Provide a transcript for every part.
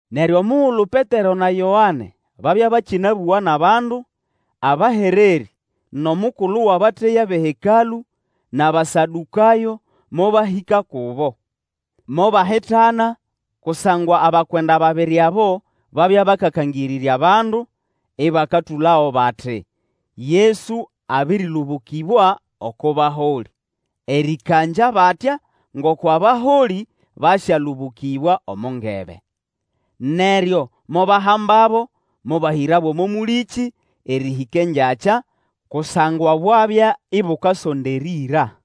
Neryo omugulu Petero na Yoane babya bakĩnabũga nʼabandu, abahererĩ, nʼomukulu wʼabateya bʼeHekalũ, nʼAbasadũkayo mobahĩka kubo. Mobahitana kusangwa abakwenda babiri abo babya bakakangĩrĩrva bandu, ĩbakatũlago bati, Yesu abĩrĩlũbũkĩbwa oko baholĩ, erĩkangya batya ngoko abaholĩ basyalũbũkĩbwa omo ngebe. Neryo mobahambabo mobahĩrabo omo mũlĩkĩ erĩhĩka engyakya, kusangwa bwabya ibukasonda erĩĩra.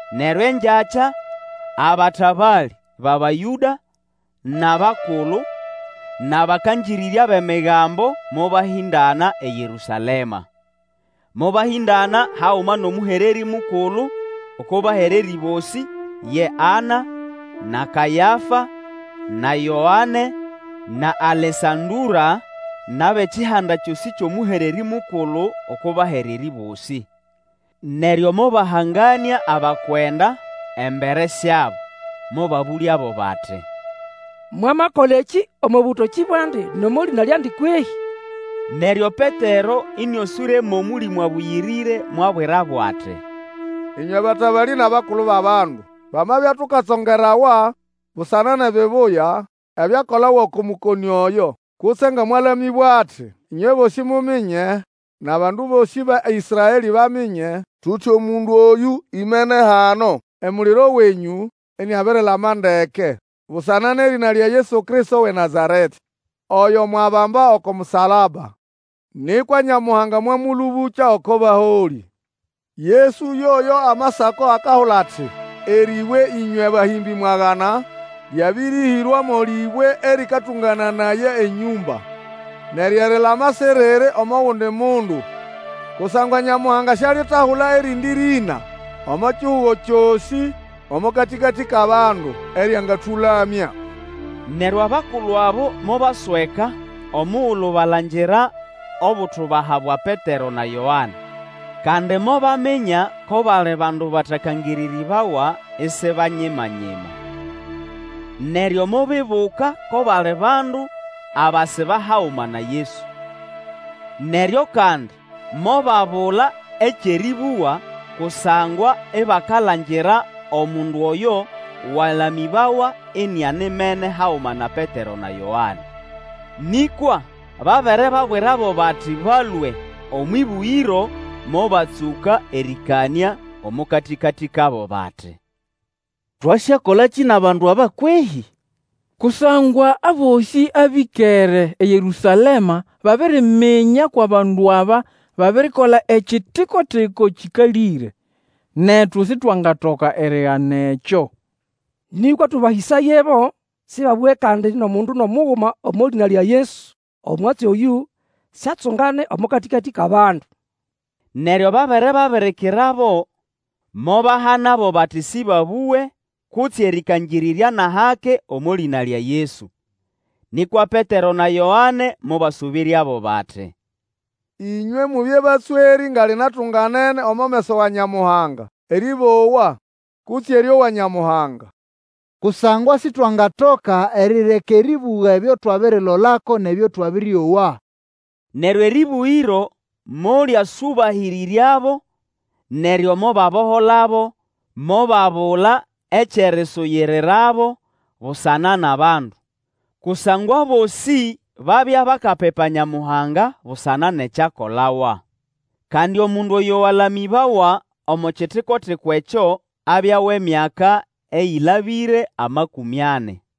Neryo engyakya abatabalĩ bʼAbayũda, nʼabakulu, nʼabakangĩrĩrya bʼEmigambo mobahĩndana eYerũsalema. Mobahĩndana haguma nʼomũhererĩ mukulu oko bahererĩ bosĩ ye Ana, na Kayafa, na Yoane na Alesandũra, nʼabʼekihanda kyosĩ kyʼomũhererĩ mukulu oko bahererĩ bosĩ. Neryo mobahunganĩa abakwenda embere syabo, mobabũlyabo bati, Mwamakola ekĩ omo bũtokĩ bwandi, nʼomo lĩna lyandi kwehĩ? Neryo Petero, ĩnĩoswĩre mʼOmũlĩmũ Abũyĩrĩre mwabwirabo ati, Ĩnywe batabalĩ nʼabakulu bʼabandu, twamabya tukatsongerawa busana nʼebibuya ebyakolawa oko mũkonĩ oyo, kutse nga mwalamĩbwa ati, ĩnywe bosĩ muminye, nʼabandu bosĩ ba Ĩsraelĩ baminye, tuti omundu oyũ imene hano emuliro wenyũ iniabirilama ndeke busana nʼerĩna lya Yesu Kristo wʼeNazaretĩ, oyo mwabamba oko musalaba, nĩkwa Nyamuhanga mwamũlũbũkya oko baholĩ. Yesu yoyo Amasako akahula ati, Erĩbwe ĩnywe bahĩmbĩ mwagana, Lyabĩrĩhĩrwa mo lĩbwe erĩkatũngananaya enyũmba. Neryo erilama siriri omo gundi mundu, kusangwa Nyamuhanga sialitahula erindi rĩna omo kihugo kyosĩ omo katĩkatĩ kʼabandu, eryangatũlamya. Neryo abakulu abo mobasweka omugulu balangira obutubaha bwa Petero na Yoane, kandi mobaminya ko bali bandu batakangĩrĩrĩbawa, isi banyimanyima. Neryo mobibuka ko bali bandu abasiba haguma na Yesu. Neryo kandi mobabula ekyʼerĩbũga, kusangwa ibakalangira omundu oyo walamĩbawa inianimene haguma na Petero na Yoane. Nĩkwa babere babwirabo bati balũe omwʼĩbũgĩro mobatsũka erĩkanĩa omo katĩkatĩ kabo, bati, Twasyakolakĩ nʼabandu aba kwehĩ? Kusangwa abosĩ abĩkere eYerũsalema babiriminya kwʼabandu aba babirikola ekitiko-tiko kĩkalĩre. Netu Sitwangatoka erigana ekyo. Nĩkwa tũbahĩsayebo sĩbabũge kandi, nʼomundu nʼomuguma omo lĩna lya Yesu, omwatsi oyũ siatsungane omo katĩkatĩ kʼabandu. Neryo babere babirikirabo, mobahanabo bati sĩbabũge kutse erĩkangĩrĩrya nʼahake omo lĩna lya Yesu. Nĩkwa Petero na Yoane mobasũbĩryabo bati, Ĩnywe mubye batswerĩ nga linatunganene omo meso wa Nyamuhanga erĩbowa, kutse erĩowa Nyamuhanga. Kusangwa Sitwangatoka erireka erĩbũga ebyo twabirilolako nʼebyo twabĩrĩowa. Neryo erĩbũgĩro molyasyũbahĩrĩryabo, neryo mobaboholabo mobabula ekyʼerisuyirirabo busana nʼabandu, kusangwa abosĩ babya bakapipa Nyamuhanga busana nʼekyakolawa. Kandi omundu oyo walamĩbawa omo kitiko-tiko ekyo abya wʼemyaka eyĩlabĩre amakũmĩ ani.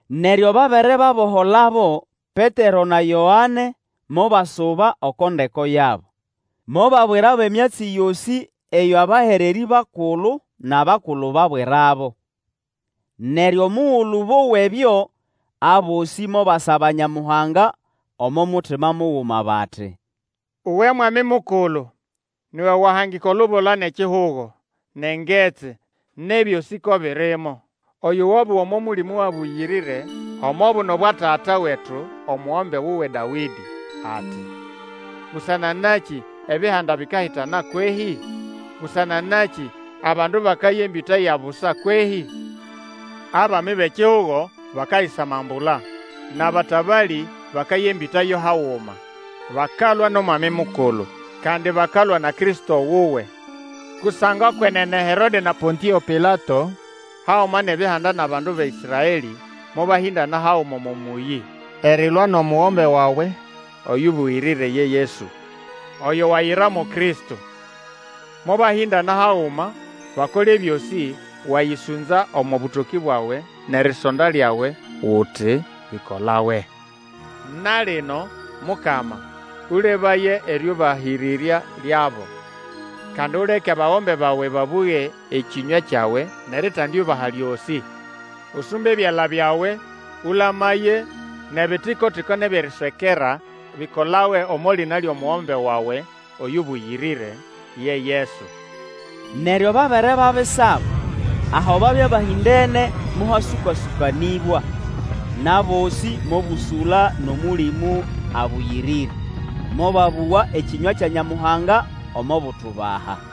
Neryo babere baboholabo, Petero na Yoane mobasuba oko ndeko yabo, mobabwirabo emyatsi yosĩ eyo abahererĩ bakulu nʼabakulu babwirabo. Neryo omugulu bowa ebyo, abosĩ mobasaba Nyamuhanga omo mutima muguma bati, Uwe Mwami Mukulu, ni iwe wahangika olubula nʼekihugo, nʼengetsi, nʼebyosĩ ko birimo! Oyo wabũga omo Mũlĩmũ Abũyĩrĩre omo buno bwa tata wetu omugombe wuwe Dawĩdĩ, ati, Busana nakĩ, ebihanda bikahitana kwehĩ? Busana nakĩ abandu bakaya embĩta ya busa kwehĩ? Abami bʼekihugo bakayisamambula, Nʼabatabalĩ bakaya embĩta yo haguma, Bakalwa nʼOmwami Mukulu, Kandi bakalwa na Kristo wuwe. Kusangwa kwenene Herode na Pontĩo Pilato, haguma nʼEbihanda nʼabandu ba Ĩsraelĩ, mobahĩndana haguma omo mũyĩ, erilwa nʼomugombe wawe oyũbũyĩrĩre ye Yesu, oyo wayira mo Kristo. Mobahĩndana haguma bakole ebyosĩ wayĩsũnza omo bũtokĩ bwawe nʼerisonda lyawe uti bikolawe. Na lino, Mukama, Ũlebaye erĩũbahĩrĩrya lyabo, kandi uleke abagombe bawe babũge ekĩnywa kyawe nʼeritendiubaha lyosĩ. Usumbe ebyala byawe, ũlamaye, nʼebitiko-tiko nʼebyʼeriswekera bikolawe omo lĩna lyʼomugombe wawe oyũbũyĩrĩre, ye Yesu. Neryo babere babisaba, aho babya bahĩndene mohasũka-sũkanĩbwa, nʼabosĩ mobũsũla nʼOmũlĩmũ Abũyĩrĩre, mobabũga ekĩnywa kya Nyamuhanga omo butubaha.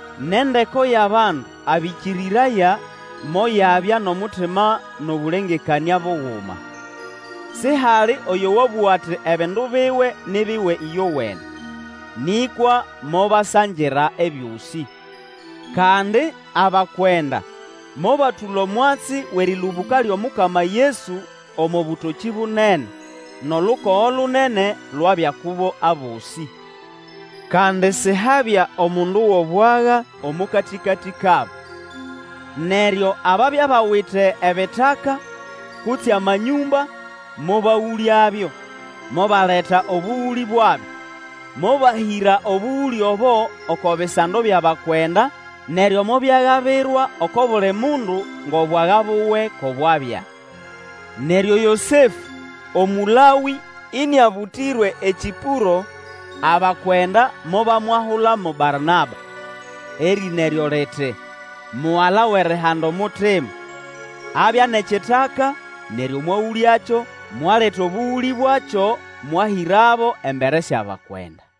Nʼendeko yʼabandu abĩkĩrĩraya moyabya nʼomutima nʼobũlengekanĩa buguma. Sihali oyo wabũga ati ebindu biwe ni biwe ĩyowene. Nĩkwa mobasangira ebyosĩ. Kandi abakwenda mobatũla omwatsi wʼerĩlũbũka lyʼomukama Yesu omo bũtokĩ bunene, nʼolukogo lunene lwabya kubo abosĩ. Kandi sihabya omundu wʼobwaga omo katĩkatĩ kabo. Neryo ababya bawite ebitaka kutse amanyũmba, mobagũlyabyo, mobaleta obũgũlĩ bwabyo, mobahĩra obũgũlĩ obo, oko bisando byʼabakwenda, neryo mobyagabirwa oko buli mundu ngʼobwaga buwe ko bwabya. Neryo Yosefũ, Omũlawĩ ĩnĩabũtĩrwe eKĩpũro, abakwenda mobamwahula mo Barnaba (erĩna eryo liti, Mugala wʼerihanda omutima), abya nʼekitaka, neryo mwagũlyakyo, mwaleta obũgũlĩ bwakyo mwahĩrabo embere syʼabakwenda.